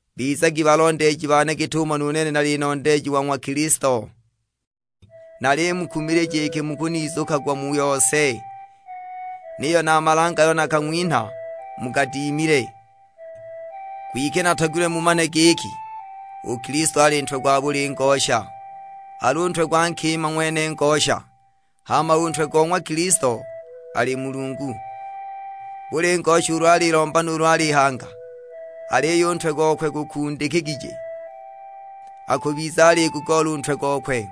Bizagi balondeeji bane git'umo nu nene nali nondeeji wa ng'wa Kilisto. Nalimukumilija iki mukunizukagwa mu yose, niyo na a malange ayo nakang'winha mugadimile. Kwike natogilwe mumane giki u Kilisto ali ntwe gwa buli ngosha, al'u ntwe gwa nkima ng'wene ngosha, hama u ntwe go ng'wa Kilisto ali Mulungu. Buli ngosha ulu alilomba nuulu alihanga aliyo u ntwe gokwe gukundikigije, akubiza aligugoola u ntwe gokwe.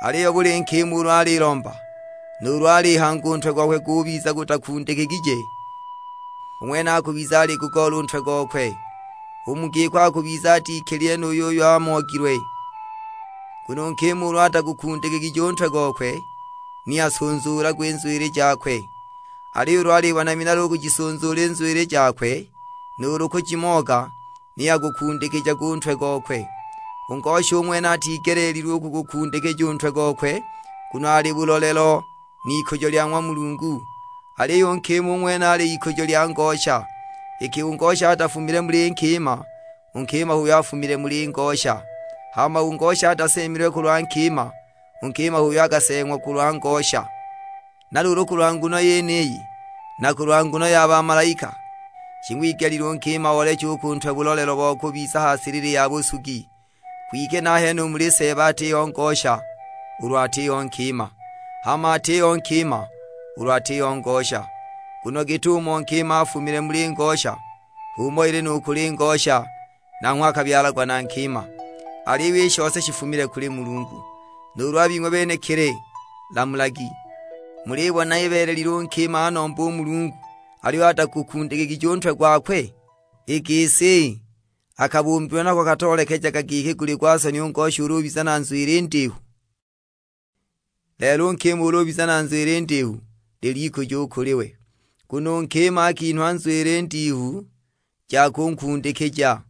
Aliyo buli nkima ulu alilomba, nuulu alihanga u ntwe gokwe gubiza gutakundikigije, u ng'wene akubiza aligugoola u ntwe gokwe, u mu giko akubiza atikilile nu yuyo amoogilwe. Nguno u nkima ulu atagukundikigije u ntwe gokwe ni asunzuulagwe i nzwili jakwe, aliyo ulu alibona minala u kujisunzuula i nzwili jakwe nuulu kujimooga, ni agukundikijage u ntwe gokwe. U ngosha u ng'wene atigeleelilwe u kugukundikija u ntwe gokwe, nguno ali bulolelo n'ikujo lya ng'wa Mulungu, aliyo u nkima u ng'wene ali ikujo lya ngosha. Iki u ngosha atafumile muli nkima; u nkima h'uyo afumile muli ngosha. Hama u ngosha ataseemilwe kulwa nkima; u nkima h'uyo akaseeng'wa kulwa ngosha. Na luulu kulwa nguno yeniyi, na kulwa nguno ya bamalaika, shing'wigelile u nkima ooleche u ku ntwe bulolelo bo kubiza ha silili ya busugi. Kwike nahene u muli Seeba atiho ngosha ulu atiho nkima, hama atiho nkima ulu atiho ngosha. Nguno git'umo nkima afumile muli ngosha, h'umo ili nu kuli ngosha; nanghwe akabyalagwa na nkima, aliyo i shose shifumile kuli Mulungu. Nuulu a bing'we benekili lamulagi, mulibona ibeelelile u nkima anombe u Mulungu aliyo atagukundikigije u ntwe gwakwe? I gisi, a kabumbilwe nako katoolekejaga giki guli gwa soni u ngosha ulu ubiza na nzwili ndihu? Lelo u nkima ulu ubiza na nzwili ndihu, lil'ikujo u kuli we. Nguno u nkima akinhwa nzwili ndihu ja kunkundikija.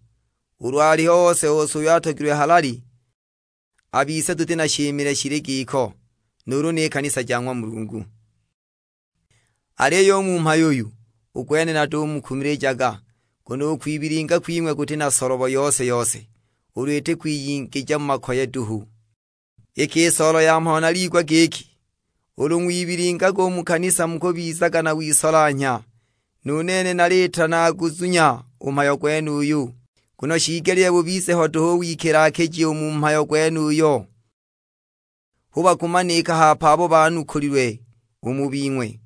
Ulu aliho ose-ose uyo atogilwe halali, a bise tuti na shimile shili giko, nuulu ni kanisa ja ng'wa Mulungu. Aliyo u mu mhayo uyu, u gwene natumukumilijaga. Nguno u kwibilinga kwing'we kuti na solobo yose-yose, ulu iti kwiyingija mu makoye duhu! Iki i soolo ya mhayo naliigwa giki, ulu ng'wibilingaga u mu kanisa mukubizaga na wisolanhya; nu nene naliita naguzunya u mhayo gwenuyu. Nguno shiigelile bubize ho duhu u wikila-kiji u mu mhayo gwenuyo, hu bakumanika hape abo banukulilwe u mu bing'we.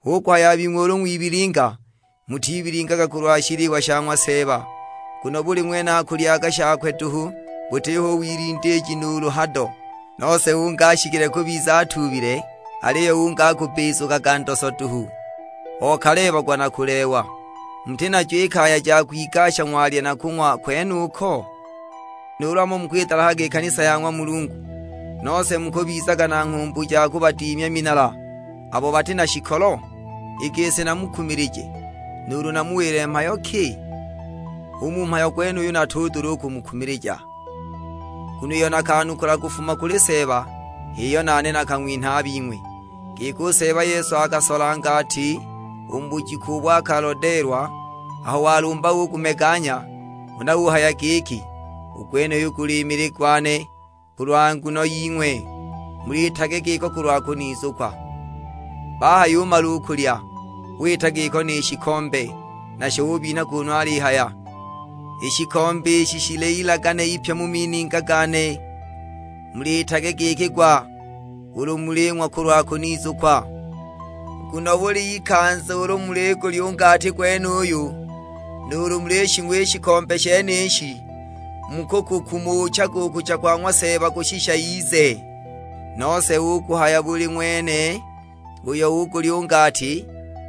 Hu kuhaya a bing'we ulu ng'wibilinga, mutibilingaga kulwa shiliwa sha ng'wa Seeba. Nguno buli ng'wene akulyaga shakwe duhu, butiho u wilindiiji nuulu hado: nose ungi ashikile kubiza atuubile, aliyo ungi akubbizukaga ndoso duhu, okaleebagwa na kuleewa! Muti najo i kaya ja kwigasha ng'walya na kung'wa kwenuko? Nuulu hamo mukwidalahaga i kanisa ya ng'wa Mulungu, nose mukubizaga na nghumbu ja kubadimya minala abo bati na shikolo? I gisi namukumilije, nuulu namuwile mhayo ki? U mu mhayo gwenuyu natudula u kumukumilija! Nguno iyo nakanukula kufuma kuli Seeba h'iyo nane nakang'winha a bing'we; giki, u Seeba Yesu akasola ngati u mu bujiku ubo akalodeelwa. Aho walumba ugumeganya; huna uhaya giki, "U gwenuyu guli mili gwane kulwa nguno ying'we, muliitage giko kulwa kunizukwa." Bahayumala u kulya, wita giko ni shikombe; nasho ubinha kunu alihaya, "I shikombe ishi shili ilagane ipya mu mininga gane, muliitage giki gwa ulu muling'wa kulwa kunizukwa." Nguno buli ikanza ulu muligulya u ngati gwenuyu, nuulu mulishing'wa i shikombe shenishi, mukukukumuchaga u kucha kwa ng'wa Seeba kushisha ize. Nose hu kuhaya buli ng'wene uyo ugulya u ngati,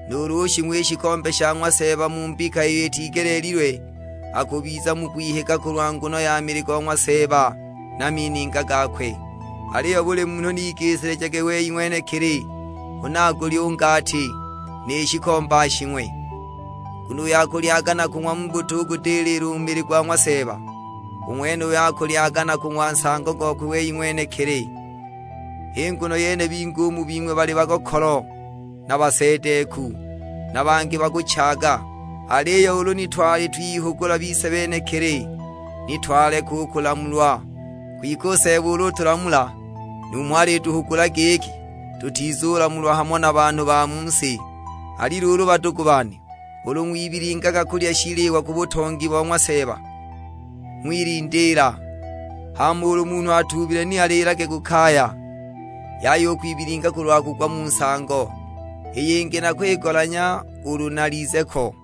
nuulu ushing'wa i shikombe sha ng'wa Seeba mu mbika iyo itigeleelilwe, akubiza mu kwihiga kulwa nguno ya mili go ng'wa Seeba na mininga gakwe. Aliyo buli munhu ni igisilijage wei ng'wenekili huna agulye u ngati, ni shikombe ashing'we. Nguno uyo akulyaga na kung'wa mu butugudilila u mili gwa ng'wa Seeba, u ng'wenuyo akulyaga na kung'wa nsango gokwe wei ng'wenekili! H'i nguno yene bingi u mu bing'we bali bagokolo na basedeeku, na bangi bakuchaaga! Aliyo ulu ni twali twihugula bise benekili, ni twaleka u kulamulwa. Kwike u Seeba ulu utulamula numho alituhugula giki tutizulamulwa hamo na banhu ba mu si. Ali luulu badugu bane, ulu ng'wibilingaga kulya shiliwa ku butongi bo ng'wa Seeba, ng'wilindiila. Hama ulu munhu atuubile ni aliilage ku kaya, yaya u kwibilinga kulwa kugwa mu nsango; i yingi nakwigolanya ulu nalize ko.